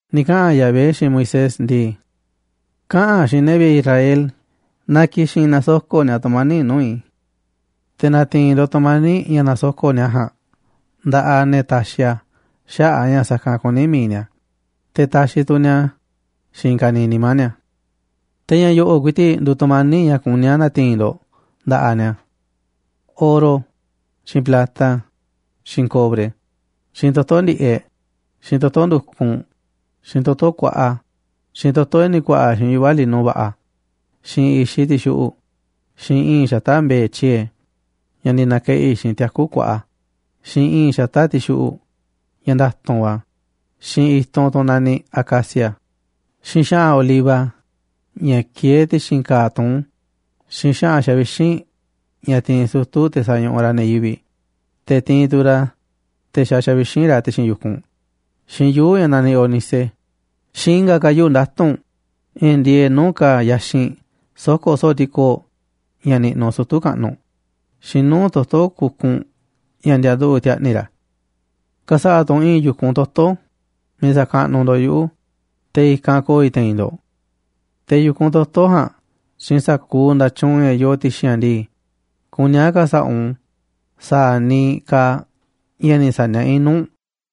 Ni̱ kaꞌa̱n Yahvé xiinꞌ Moisés ndii: ―Kaꞌa̱n xiinꞌ ne̱ vi̱ꞌe̱ Israel na ki̱xi̱n na̱soko̱ꞌ ni̱a̱ tu̱mani̱ꞌ nuu̱ꞌ i̱. Te̱ na̱ti̱i̱n ndo̱ꞌ tu̱mani̱ꞌ ña̱ nasoko̱ꞌ ni̱a̱ ja̱a̱nꞌ nda̱ꞌaꞌ ne̱ taxiꞌ a̱ xaꞌa̱ꞌ a̱ ña̱ sa̱kanꞌ kuní mi̱iꞌ ni̱a̱, te̱ taxiꞌ tu̱ ni̱a̱ a̱ xiinꞌ i̱i̱n ka̱niiꞌ nimá ni̱a̱. Te̱ ña̱ yo̱ꞌo̱ꞌ ku̱i̱ti̱ꞌ nduuꞌ tu̱mani̱ꞌ ña̱ kuní a̱ na̱ti̱i̱n ndo̱ꞌ nda̱ꞌaꞌ ni̱a̱: oro, xiinꞌ plata, xiinꞌ cobre, xiinꞌ toto̱ ndi̱ꞌeꞌ, xiinꞌ toto̱ ndu̱kunꞌ, xiinꞌ toto̱ kuaꞌa, xiinꞌ toto̱ ña̱ ni̱ ku̱a̱ꞌa̱ xiinꞌ yuꞌva̱ lino va̱ꞌa̱, xiinꞌ i̱xiꞌ ti̱xuꞌu̱ꞌ, xiinꞌ i̱i̱nꞌ xata̱ꞌ mbe̱e̱ tyie̱e, ña̱ ni̱ na̱keꞌi̱ xiinꞌ tiaku̱ kuaꞌa, xiinꞌ i̱i̱nꞌ xata̱ꞌ ti̱xuꞌu̱ꞌ ña̱ nda̱tu̱nꞌ va̱, xiinꞌ i̱tunꞌ tunꞌ naniꞌ acacia, xiinꞌ xa̱ꞌa̱n oliva ña̱ kieé ti̱xi̱n ka̱a̱ tuún, xiinꞌ xa̱ꞌa̱n xavixínꞌ ña̱ tiinꞌ sutu̱ te̱ sañuꞌuꞌ ra̱ ne̱ yivi̱ꞌ, te̱ tiinꞌ tu̱ ra̱ a̱ te̱ xa xavixínꞌ ra̱ ti̱xi̱n yu̱kunꞌ, xiinꞌ yuu̱ꞌ ña̱ naniꞌ ónice, xiinꞌ i̱nga̱ ka̱ yuu̱ꞌ nda̱tu̱nꞌ ña̱ ndieeꞌ nuu̱ꞌ ka̱a̱ yaxinꞌ soko̱ soo̱ꞌ ti̱koo̱ꞌ ña̱ niꞌnuꞌ sutu̱ kaꞌnuꞌ, xiinꞌ nuu̱ꞌ toto̱ kukunꞌ ña̱ ndianduꞌu̱ꞌ ti̱a̱ꞌni̱ ra̱. Ka̱sa̱ꞌa̱ tu̱ u̱nꞌ i̱i̱n yu̱kunꞌ toto̱ miiꞌ sa̱kaꞌnuꞌ ndo̱ꞌ yuꞌu̱, te̱ i̱kanꞌ ko̱o̱ i̱ te̱i̱n ndo̱ꞌ. Te̱ yu̱kunꞌ toto̱ ja̱a̱nꞌ xiinꞌ sa̱kuuꞌ nda̱tyuunꞌ ña̱ yoo ti̱xi̱n a̱ ndii, kuní a̱ ka̱sa̱ꞌa̱ u̱nꞌ u̱n sa̱a̱ niiꞌ kaaꞌ ña̱ ni̱ saniaꞌá i̱ nuu̱ꞌ u̱nꞌ.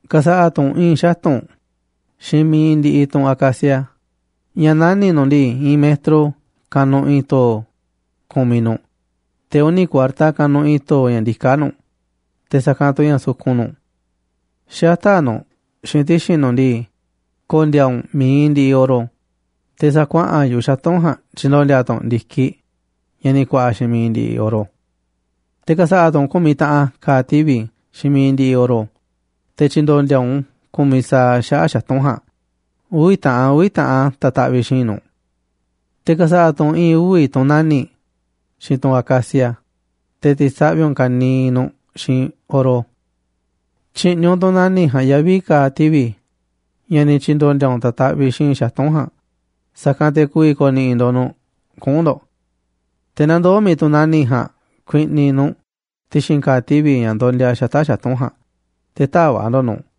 ’Ka̱sa̱ꞌa̱ tu̱ u̱nꞌ i̱i̱n xatu̱nꞌ xiinꞌ mi̱iꞌ ndiꞌiꞌ tunꞌ acacia ña̱ nani̱ꞌ nu̱ꞌ ndii, i̱i̱n metro kanuꞌ i̱i̱n to̱o̱ ku̱miꞌ nu̱ꞌ, te̱ uni̱ kuarta kanuꞌ i̱i̱n to̱o̱ ña̱ ndiká nu̱ꞌ, te̱ sa̱kanꞌ tu̱ ña̱ sukun nu̱ꞌ. Xata̱ꞌ nu̱ꞌ xiinꞌ ti̱xi̱n nu̱ꞌ ndii, ko̱ndi̱a̱ u̱nꞌ mi̱iꞌ ndiꞌiꞌ oro, te̱ sa̱a̱ kuaꞌa̱n yu̱ꞌuꞌ xatu̱nꞌ ja̱a̱nꞌ tyi̱ndo̱ndi̱a̱ tu̱ u̱nꞌ ndi̱kiꞌ ña̱ ni̱ ku̱a̱ꞌa̱ xiinꞌ mi̱iꞌ ndiꞌiꞌ oro. Te̱ ka̱sa̱ꞌa̱ tu̱ u̱nꞌ ku̱miꞌ taꞌan ka̱a̱ tivi̱ xiinꞌ mi̱iꞌ ndiꞌiꞌ oro, te̱ tyi̱ndo̱ndi̱a̱ u̱nꞌ ku̱miꞌ sa̱aꞌ a̱ xaꞌa̱ꞌ xatu̱nꞌ ja̱a̱nꞌ, uvi̱ taꞌan, uvi̱ taꞌan ta̱taꞌviꞌ xi̱i̱nꞌ nu̱ꞌ. Te̱ ka̱sa̱ꞌa̱ tu̱ u̱nꞌ i̱i̱n uvi̱ tunꞌ nani̱ꞌ xiinꞌ tunꞌ acacia, te̱ ti̱saꞌvi̱ u̱nꞌ ka̱niiꞌ nu̱ꞌ xiinꞌ oro. Tyi̱ꞌni̱ u̱nꞌ tunꞌ nani̱ꞌ ja̱a̱nꞌ yavi̱ ka̱a̱ tivi̱ ña̱ ni̱ tyi̱ndo̱ndi̱a̱ u̱nꞌ ta̱taꞌviꞌ xi̱i̱nꞌ xatu̱nꞌ ja̱a̱nꞌ, sa̱kanꞌ te̱ ku̱vi̱ ko̱ni̱ꞌi̱ ndo̱ꞌ nu̱ꞌ kuꞌu̱n ndo̱ꞌ. Te̱ na ndoo̱ mi̱iꞌ tunꞌ nani̱ꞌ ja̱a̱nꞌ ku̱i̱ꞌni̱ nu̱ꞌ ti̱xi̱n ka̱a̱ tivi̱ ña̱ ndondia xata̱ꞌ xatu̱nꞌ ja̱a̱nꞌ, te̱ tä̱va̱ꞌ ndo̱ꞌ nu̱ꞌ.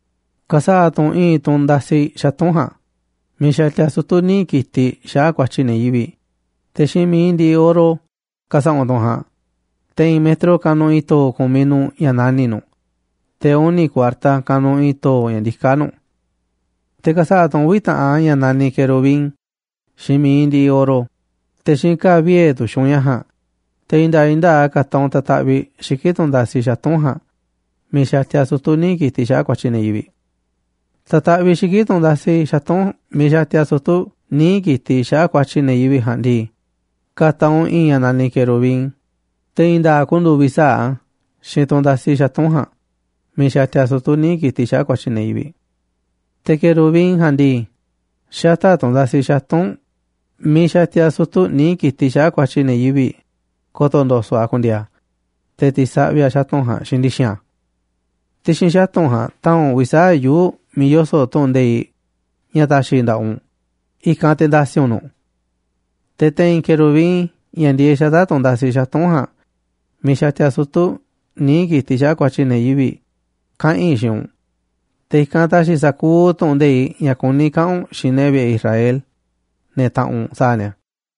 Ka̱sa̱ꞌa̱ tu̱ u̱nꞌ i̱i̱n tunꞌ nda̱si̱ xatu̱nꞌ ja̱a̱nꞌ miiꞌ xatia sutu̱ níiꞌ ki̱tiꞌ xaꞌa̱ꞌ ku̱a̱tyi̱ ne̱ yivi̱ꞌ, te̱ xiinꞌ mi̱iꞌ ndiꞌiꞌ oro ka̱sa̱ꞌa̱ u̱nꞌ tunꞌ ja̱a̱nꞌ, te̱ i̱i̱n metro kanuꞌ i̱i̱n to̱o̱ ku̱miꞌ nu̱ꞌ ña̱ nani̱ꞌ nu̱ꞌ, te̱ uni̱ kuarta kanuꞌ i̱i̱n to̱o̱ ña̱ ndiká nu̱ꞌ. Te̱ ka̱sa̱ꞌa̱ tu̱ u̱nꞌ uvi̱ taꞌan ña̱ naniꞌ querubin xiinꞌ mi̱iꞌ ndiꞌiꞌ oro, te̱ xiinꞌ ka̱a̱ vie̱ tu̱xiꞌ u̱nꞌ ña̱ ja̱a̱nꞌ, te̱ i̱i̱n nda̱a̱ꞌ i̱i̱n nda̱a̱ꞌ a̱ ka̱ta̱ u̱nꞌ ta̱taꞌviꞌ xiki̱ꞌ tunꞌ ndasi xatu̱nꞌ ja̱a̱nꞌ miiꞌ xatia sutu̱ níiꞌ ki̱tiꞌ xaꞌa̱ꞌ ku̱a̱tyi̱ ne̱ yivi̱ꞌ. Ta̱taꞌviꞌ xiki̱ꞌ tunꞌ ndasi xatu̱nꞌ miiꞌ xatia sutu̱ níiꞌ ki̱tiꞌ xaꞌa̱ꞌ ku̱a̱tyi̱ ne̱ yivi̱ꞌ ja̱a̱nꞌ ndii, ka̱ta̱ u̱nꞌ i̱ꞌi̱n ña̱ naniꞌ querubin, te̱ i̱i̱n nda̱a̱ꞌ ku̱ndu̱u̱ uvi̱ sa̱aꞌ a̱ xiinꞌ tunꞌ ndasi xatu̱nꞌ ja̱a̱nꞌ miiꞌ xatia sutu̱ níiꞌ ki̱tiꞌ xaꞌa̱ꞌ ku̱a̱tyi̱ ne̱ yivi̱ꞌ. Te̱ querubin ja̱a̱nꞌ ndii, xata̱ꞌ tunꞌ ndasi xatu̱nꞌ miiꞌ xatia sutu̱ níiꞌ ki̱tiꞌ xaꞌa̱ꞌ ku̱a̱tyi̱ ne̱ yivi̱ꞌ, ko̱to̱ ndo̱so̱ꞌ a̱ ku̱ndi̱e̱e̱ a̱, te̱ ti̱saꞌvi̱ a̱ xatu̱nꞌ ja̱a̱nꞌ xiinꞌ ndi̱xi̱n a̱. Ti̱xi̱n xatu̱nꞌ ja̱a̱nꞌ ta̱a̱nꞌ u̱nꞌ uvi̱ sa̱aꞌ yuu̱ꞌ miiꞌ yoso̱ꞌ tu̱ꞌu̱n nde̱iꞌ ña̱ ta̱xi̱ i̱ nda̱ꞌaꞌ u̱nꞌ, i̱kanꞌ te̱ nda̱si̱ u̱nꞌ nu̱ꞌ. Te̱ te̱i̱n querubin, ña̱ ndieeꞌ xata̱ꞌ tunꞌ ndasi xatu̱nꞌ ja̱a̱nꞌ, miiꞌ xatia sutu̱ níiꞌ ki̱tiꞌ xaꞌa̱ꞌ ku̱a̱tyi̱ ne̱ yivi̱ꞌ, kaꞌa̱n i̱ xiinꞌ u̱nꞌ. Te̱ i̱kanꞌ ta̱xi̱ i̱ sa̱kuuꞌ tu̱ꞌu̱n nde̱iꞌ ña̱ kuní i̱ kaꞌa̱n u̱nꞌ xiinꞌ ne̱ vi̱ꞌe̱ Israel, ne̱ taꞌanꞌ u̱nꞌ, sa̱a̱ ni̱a̱.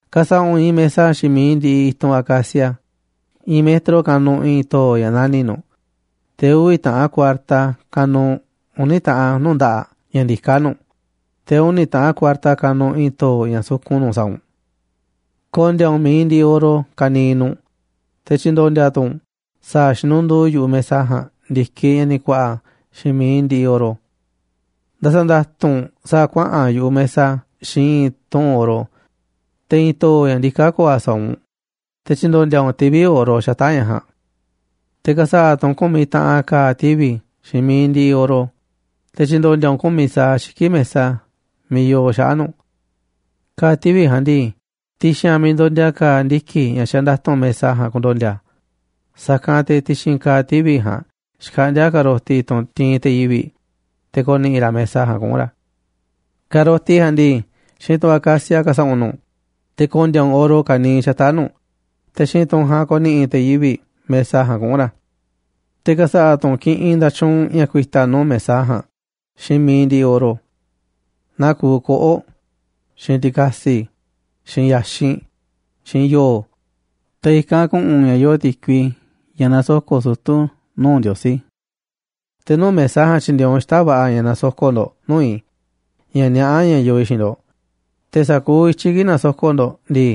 ’Ka̱sa̱ꞌa̱ u̱nꞌ i̱i̱n mesa xiinꞌ mi̱iꞌ ndiꞌiꞌ i̱tunꞌ acacia. I̱i̱n metro kanuꞌ i̱i̱n to̱o̱ ña̱ nani̱ꞌ nu̱ꞌ, te̱ uvi̱ taꞌan kuarta kanuꞌ uni̱ taꞌan nuu̱ꞌ nda̱ꞌaꞌ ña̱ ndiká nu̱ꞌ, te̱ uni̱ taꞌan kuarta kanuꞌ i̱i̱n to̱o̱ ña̱ sukun nu̱ꞌ sa̱a̱ u̱nꞌ. Ko̱ndi̱a̱ u̱nꞌ mi̱iꞌ ndiꞌiꞌ oro ka̱niiꞌ nu̱ꞌ, te̱ tyi̱ndo̱ndi̱a̱ tu̱ u̱nꞌ sa̱a̱ xinunduu yu̱ꞌuꞌ mesa ja̱a̱nꞌ ndi̱kiꞌ ña̱ ni̱ ku̱a̱ꞌa̱ xiinꞌ mi̱iꞌ ndiꞌiꞌ oro. Nda̱sa̱nda̱tu̱nꞌ u̱nꞌ sa̱a̱ kuaꞌa̱n yu̱ꞌuꞌ mesa xiinꞌ i̱i̱n tuꞌu̱nꞌ oro, te̱ i̱i̱n to̱o̱ ña̱ ndiká ko̱o̱ a̱ sa̱a̱ u̱nꞌ, te̱ tyi̱ndo̱ndi̱a̱ u̱nꞌ tivi̱ oro xata̱ꞌ ña̱ ja̱a̱nꞌ. Te̱ ka̱sa̱ꞌa̱ tu̱ u̱nꞌ ku̱miꞌ taꞌan ka̱a̱ tivi̱ xiinꞌ mi̱iꞌ ndiꞌiꞌ oro, te̱ tyi̱ndo̱ndi̱a̱ u̱nꞌ u̱n ku̱miꞌ sa̱aꞌ xiki̱ꞌ mesa miiꞌ yoo xaꞌa̱ꞌ nu̱ꞌ. Ka̱a̱ tivi̱ ja̱a̱nꞌ ndii, ti̱xi̱n a̱ miiꞌ ndondia ka̱a̱ ndiki̱ ña̱ xanda̱tu̱nꞌ mesa ja̱a̱nꞌ ku̱ndo̱ndi̱a̱ a̱, sa̱kanꞌ te̱ ti̱xi̱n ka̱a̱ tivi̱ ja̱a̱nꞌ xkaꞌndi̱a̱ ka̱roti, tunꞌ ti̱i̱n te̱ yivi̱ꞌ, te̱ ko̱ni̱ꞌi̱ ra̱ mesa ja̱a̱nꞌ kuꞌu̱n ra̱. Ka̱roti ja̱a̱nꞌ ndii xiinꞌ tunꞌ acacia ka̱sa̱ꞌa̱ u̱nꞌ nu̱ꞌ, te̱ ko̱ndi̱a̱ u̱nꞌ oro ka̱niiꞌ xata̱ꞌ nu̱ꞌ, te̱ xiinꞌ tunꞌ ja̱a̱nꞌ ko̱ni̱ꞌi̱ te̱ yivi̱ꞌ mesa ja̱a̱nꞌ kuꞌu̱n ra̱. Te̱ ka̱sa̱ꞌa̱ tu̱ u̱nꞌ kiꞌinꞌ nda̱tyuunꞌ ña̱ ku̱i̱ta̱ nuu̱ꞌ mesa ja̱a̱nꞌ xiinꞌ mi̱iꞌ ndiꞌiꞌ oro, naa kuuꞌ koꞌo̱ꞌ, xiinꞌ ti̱ka̱si̱, xiinꞌ ya̱xinꞌ, xiinꞌ yo̱o̱, te̱ i̱kanꞌ ku̱ꞌu̱n ña̱ yoo ti̱kui, ña̱ nasoko̱ꞌ sutu̱ nuu̱ꞌ Ndiosí. Te̱ nuu̱ꞌ mesa ja̱a̱nꞌ tyi̱ndi̱e̱e̱ u̱nꞌ xita̱ꞌ va̱ꞌa̱ ña̱ na̱soko̱ꞌ ndo̱ꞌ nuu̱ꞌ i̱ ña̱ niaꞌá ña̱ yoo i̱ xiinꞌ ndo̱ꞌ, te̱ sa̱kuuꞌ i̱tyiꞌ kii̱ꞌ nasoko̱ꞌ ndo̱ꞌ ndii,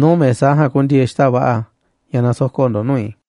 nuu̱ꞌ mesa ja̱a̱nꞌ ku̱ndi̱e̱e̱ xita̱ꞌ va̱ꞌa̱ ña̱ nasoko̱ꞌ ndo̱ꞌ nuu̱ꞌ i̱.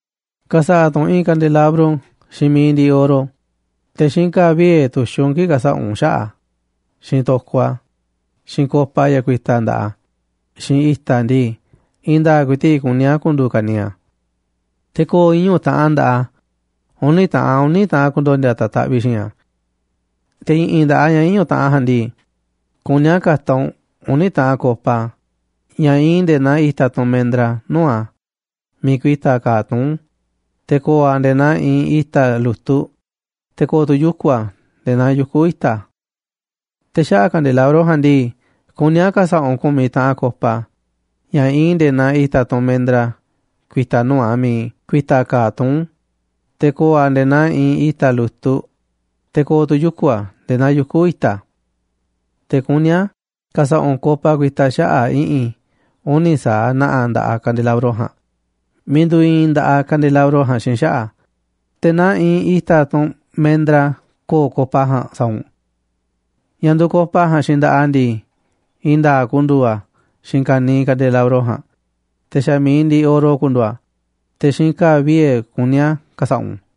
’Ka̱sa̱ꞌa̱ tu̱ u̱nꞌ i̱i̱n kandelabro xiinꞌ mi̱iꞌ ndiꞌiꞌ oro, te̱ xiinꞌ ka̱a̱ vie̱ tu̱xiꞌ u̱nꞌ u̱n kii̱ꞌ ka̱sa̱ꞌa̱ u̱nꞌ xaꞌa̱ꞌ a̱, xiinꞌ to̱koꞌ a̱, xiinꞌ copa ña̱ ku̱i̱ta̱ nda̱ꞌaꞌ a̱, xiinꞌ i̱ta̱ a̱ ndii, i̱i̱n nda̱a̱ꞌ ku̱i̱ti̱ꞌ kuní a̱ ku̱ndu̱u̱ ka̱niiꞌ a̱. Te̱ ko̱o̱ iñu̱ taꞌan nda̱ꞌaꞌ a̱, uni̱ taꞌan uni̱ taꞌan a̱ ku̱ndo̱ndi̱a̱ ta̱taꞌviꞌ xi̱i̱nꞌ a̱. Te̱ i̱ꞌi̱n nda̱ꞌaꞌ a̱ ña̱ iñu̱ taꞌan ja̱a̱nꞌ ndii, kuní a̱ ka̱ta̱ u̱nꞌ uni̱ taꞌan copa ña̱ iinꞌ nde̱e̱ naa i̱ta̱ tunꞌ mendra nuu̱ꞌ a̱ miiꞌ ku̱i̱ta̱ ka̱a̱ tuún, te̱ ko̱o̱ a̱ nde̱e̱ naa iinꞌ i̱ta̱ lu̱tuꞌ, te̱ ko̱o̱ tu̱ yuku̱ a̱ nde̱e̱ naa yuku̱ i̱ta̱. Te̱ xaꞌa̱ꞌ kandelabro ja̱a̱nꞌ ndii, kuní a̱ ka̱sa̱ꞌa̱ u̱nꞌ ku̱miꞌ taꞌan copa ña̱ iinꞌ nde̱e̱ naa i̱ta̱ tunꞌ mendra ku̱i̱ta̱ nuu̱ꞌ a̱ miiꞌ ku̱i̱ta̱ ka̱a̱ tuún, te̱ ko̱o̱ a̱ nde̱e̱ naa iinꞌ i̱ta̱ lu̱tuꞌ, te̱ ko̱o̱ tu̱ yuku̱ a̱ nde̱e̱ naa yuku̱ i̱ta̱. Te̱ kuní a̱ ka̱sa̱ꞌa̱ u̱nꞌ copa ku̱i̱ta̱ xaꞌa̱ꞌ i̱ꞌi̱n uni̱ sa̱aꞌ na̱ꞌa̱ nda̱ꞌaꞌ kandelabro ja̱a̱nꞌ miiꞌ nduuꞌ iinꞌ nda̱ꞌaꞌ kandelabro ja̱a̱nꞌ xiinꞌ xaꞌa̱ꞌ a̱, te̱ naa iinꞌ i̱ta̱ tunꞌ mendra ko̱o̱ copa ja̱a̱nꞌ sa̱a̱ u̱nꞌ. Ña̱ nduuꞌ copa ja̱a̱nꞌ xiinꞌ nda̱ꞌaꞌ a̱ ndii, i̱i̱n nda̱a̱ꞌ ku̱ndu̱u̱ a̱ xiinꞌ ka̱niiꞌ kandelabro ja̱a̱nꞌ, te̱ xa̱ mi̱iꞌ ndiꞌiꞌ oro ku̱ndu̱u̱ a̱, te̱ xiinꞌ ka̱a̱ vie̱ kuní a̱ ka̱sa̱ꞌa̱ u̱nꞌ.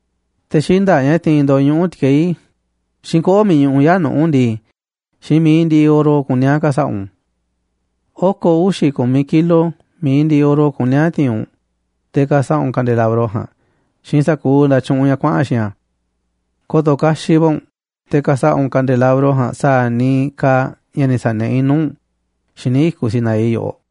Te̱ xinda̱ꞌ ña̱ tiinꞌ ndo̱ꞌ ñuꞌu̱ ti̱keí, xiinꞌ koꞌo̱ꞌ miiꞌ ñuꞌuꞌ yaa̱ꞌ nuꞌu̱ ndii, xiinꞌ mi̱iꞌ ndiꞌiꞌ oro kuní a̱ ka̱sa̱ꞌa̱ u̱nꞌ u̱n. Oko̱ uxi̱ ku̱miꞌ kilo mi̱iꞌ ndiꞌiꞌ oro kuní a̱ ti̱i̱n u̱nꞌ te̱ ka̱sa̱ꞌa̱ u̱nꞌ kandelabro ja̱a̱nꞌ xiinꞌ sa̱kuuꞌ nda̱tyuunꞌ ña̱ kuaꞌa̱n xiinꞌ a̱. Ko̱to̱ kaxiꞌ va̱ u̱nꞌ te̱ ka̱sa̱ꞌa̱ u̱nꞌ kandelabro ja̱a̱nꞌ sa̱a̱ niiꞌ kaaꞌ ña̱ ni̱ sa̱niaꞌá i̱ nuu̱ꞌ u̱nꞌ xíniꞌ i̱kuꞌ Sinaí yoꞌoꞌ.